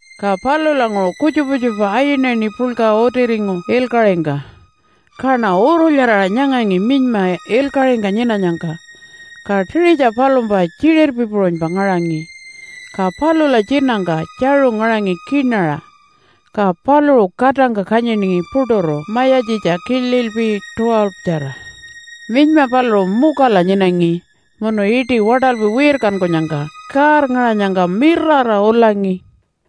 Ka palulanguṟu kutjupa kutjupa ayinayini puḻka utiringu ilkaṟingka. Kaṉa urulyaraṟa nyangangi minyma ilkaṟingka nyinanyangka, ka tiṟitja palumpa tjiṟirpi puṟunypa ngaṟangi, ka palula tjinangka tjaṟu ngaṟangi kiṉaṟa, ka paluṟu katangka kanyiningi puṯuru mayatjitja kililpi 12-tjara. Minyma paluṟu mukala nyinangi munu iṯi waṯalpi wirkankunyangka kaarngaṟanyangka mirara ulangi.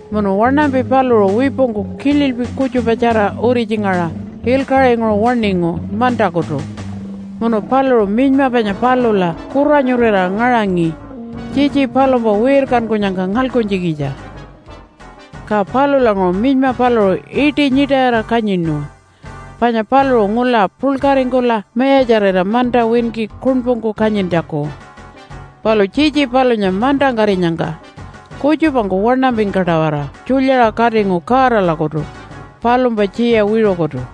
Munu waṉampi paluṟu wipungku kililpi kutjupatjara uritjingaṟa ilkaṟinguṟu waṉingu mantakutu munu paluṟu minyma panya palula kuranyurira ngaṟangi tjitji palumpa wirkankunyangka ngalkuntjikitja. Ka palulanguṟu minyma paluṟu iṯi nyiṯayira kanyinu, panya paluṟu ngula puḻkaringkula mayatjarira manta winki kuṉpungku kanyintjaku. Palu tjitji palunya mantangkarinyangka kutjupangku waṉampingka-tawara tjulyaṟa katingu Godalakutu palumpa tjiya wiṟukutu.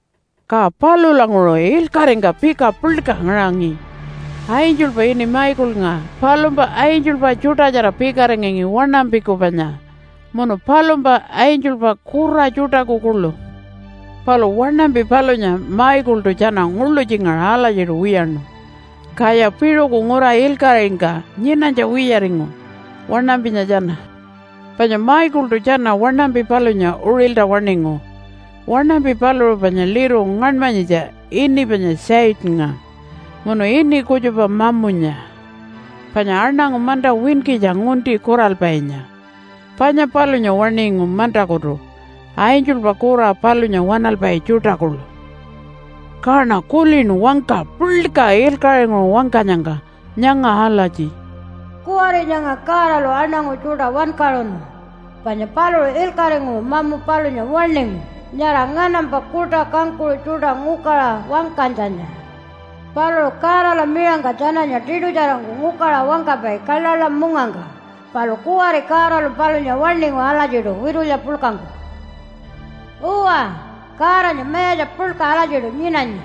Ka palulanguṟu ilkaṟingka pika puḻka ngaṟangi. Angelpa ini Michaelnga palumpa angelpa tjuṯatjara pikaringangi waṉampiku panya munu palumpa angelpa kura tjuṯaku kuḻu. Palu waṉampi palunya Michaeltu tjana nguḻutjingaṟa alatjiṯu wiyaṉu, kaya piṟuku ngura ilkaṟingka nyinanytja wiyaringu waṉampinya tjana. Panya Michaeltu tjana waṉampi palunya uṟilta waṉingu. Waṉampi paluṟu panya liru ngaṉmanyitja ini panya Satannga munu ini kutjupa Mamunya, panya aṉangu manta winkitja ngunti kuralpainya. Panya palunya waṉingu mantakutu angelpa kura palunya waṉalpai tjuṯa kuḻu. Kaṉa kulinu wangka puḻka ilkaṟinguṟu wangkanyangka nyanga alatji, “Kuwari nyanga Godalu aṉangu tjuṯa wankaṟunu panya paluṟu ilkaṟinguṟu mamu palunya waṉingu nyara nganampa kuṯa kangkuṟu tjuṯa ngukaṟa wangkanytjanya. Paluṟu Godala miṟangka tjananya tiṯutjarangku ngukaṟa wangkapai kaḻaḻa mungangka. Palu kuwari Godalu palunya waṉingu alatjiṯu witulya puḻkangku. Uwa, Godanya mayatja puḻka alatjiṯu nyinanyi,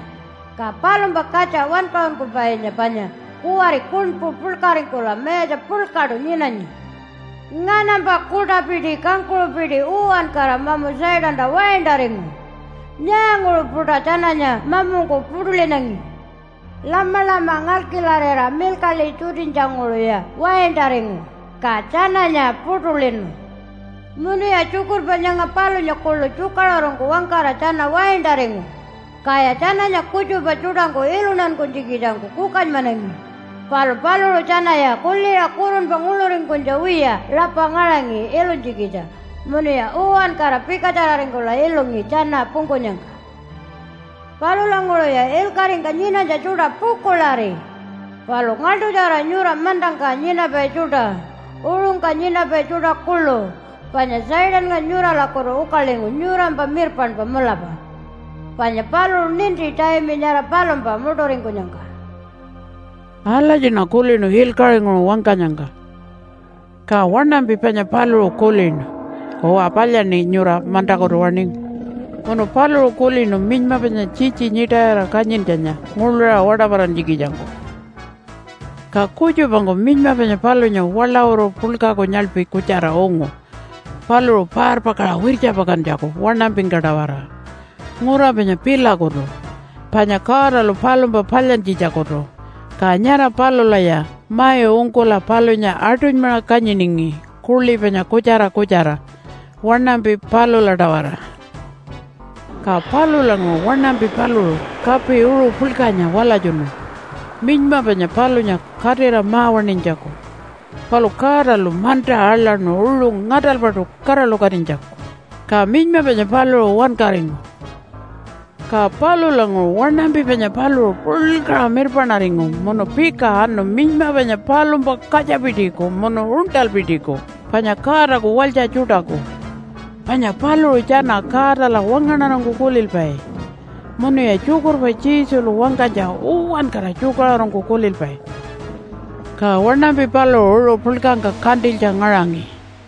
ka palumpa katja Wankaṟunkupainya panya kuwari kuṉpu puḻkaringkula mayatja puḻkaṯu nyinanyi. Nganampa kuṯapiti kangkuṟupiti uwankara mamu Satanta waintaringu. Nyaanguṟu-puṯa tjananya mamungku puṯulinangi? Lamalama ngalkilarira milkaḻi tjutinytjanguṟuya waintaringu ka tjananya puṯulinu. Munuya tjukurpa nyanga palunya kuḻu tjukaṟurungku wangkara tjana waintaringu, kaya tjananya kutjupa tjuṯangku iluntankunytjikitjangku kukanymanangi, palu paluṟu tjanaya kuliṟa kurunpa nguḻuringkunytja wiya rapa ngaṟangi ilunytjikitja munuya uwankara pikatjararingkula ilungi tjana pungkunyangka. Palulanguṟuya ilkaṟingka nyinanytja tjuṯa pukuḻari! Palu ngaḻṯutjara nyura mantangka nyinapai tjuṯa, uṟungka nyinapai tjuṯa kuḻu, panya Satannga nyuralakutu ukalingu nyurampa mirpaṉpa mulapa panya paluṟu ninti taimi nyara palumpa muṯuringkunyangka.” Alatjiṉa kulinu ilkaṟinguṟu wangkanyangka. Ka waṉampi panya paluṟu kulinu, “Uwa, palyaṉi nyura mantakutu waṉingu.” Munu paluṟu kulinu minyma panya tjitji nyiṯayira kanyintjanya nguḻuṟa waṯaparantjikitjangku. Ka kutjupangku minyma panya palunya waḻawuru puḻkaku nyaḻpi kutjara ungu paluṟu parpakaṟa wirtjapakantjaku waṉampingka-tawara ngura panya pilakutu panya Godalu palumpa palyantjitjakutu. Ka nyara palulaya mai ungkula palunya aṯunymaṟa kanyiningi kuḻi panya kutjara kutjara waṉampi palula-tawara. Ka palulanguṟu waṉampi paluṟu kapi uṟu puḻkanya walatjunu minyma panya palunya katira ma-waṉinytjaku. Palu Godalu manta aḻaṉu uṟu ngaṯalpaṯu kaṟalukatinytjaku, ka minyma panya paluṟu wankaringu. Ka palulanguṟu waṉampi panya paluṟu puḻkaṟa mirpaṉaringu munu pika anu minyma panya palumpa katjapitiku munu uṉṯalpitiku panya Godaku walytja tjuṯaku, panya paluṟu tjana Godala wangaṉarangku kulilpai munuya tjukurpa Jesulu wangkanytja uwankara tjukaṟurungku kulilpai. Ka waṉampi paluṟu uṟu puḻkangka kantilytja ngaṟangi.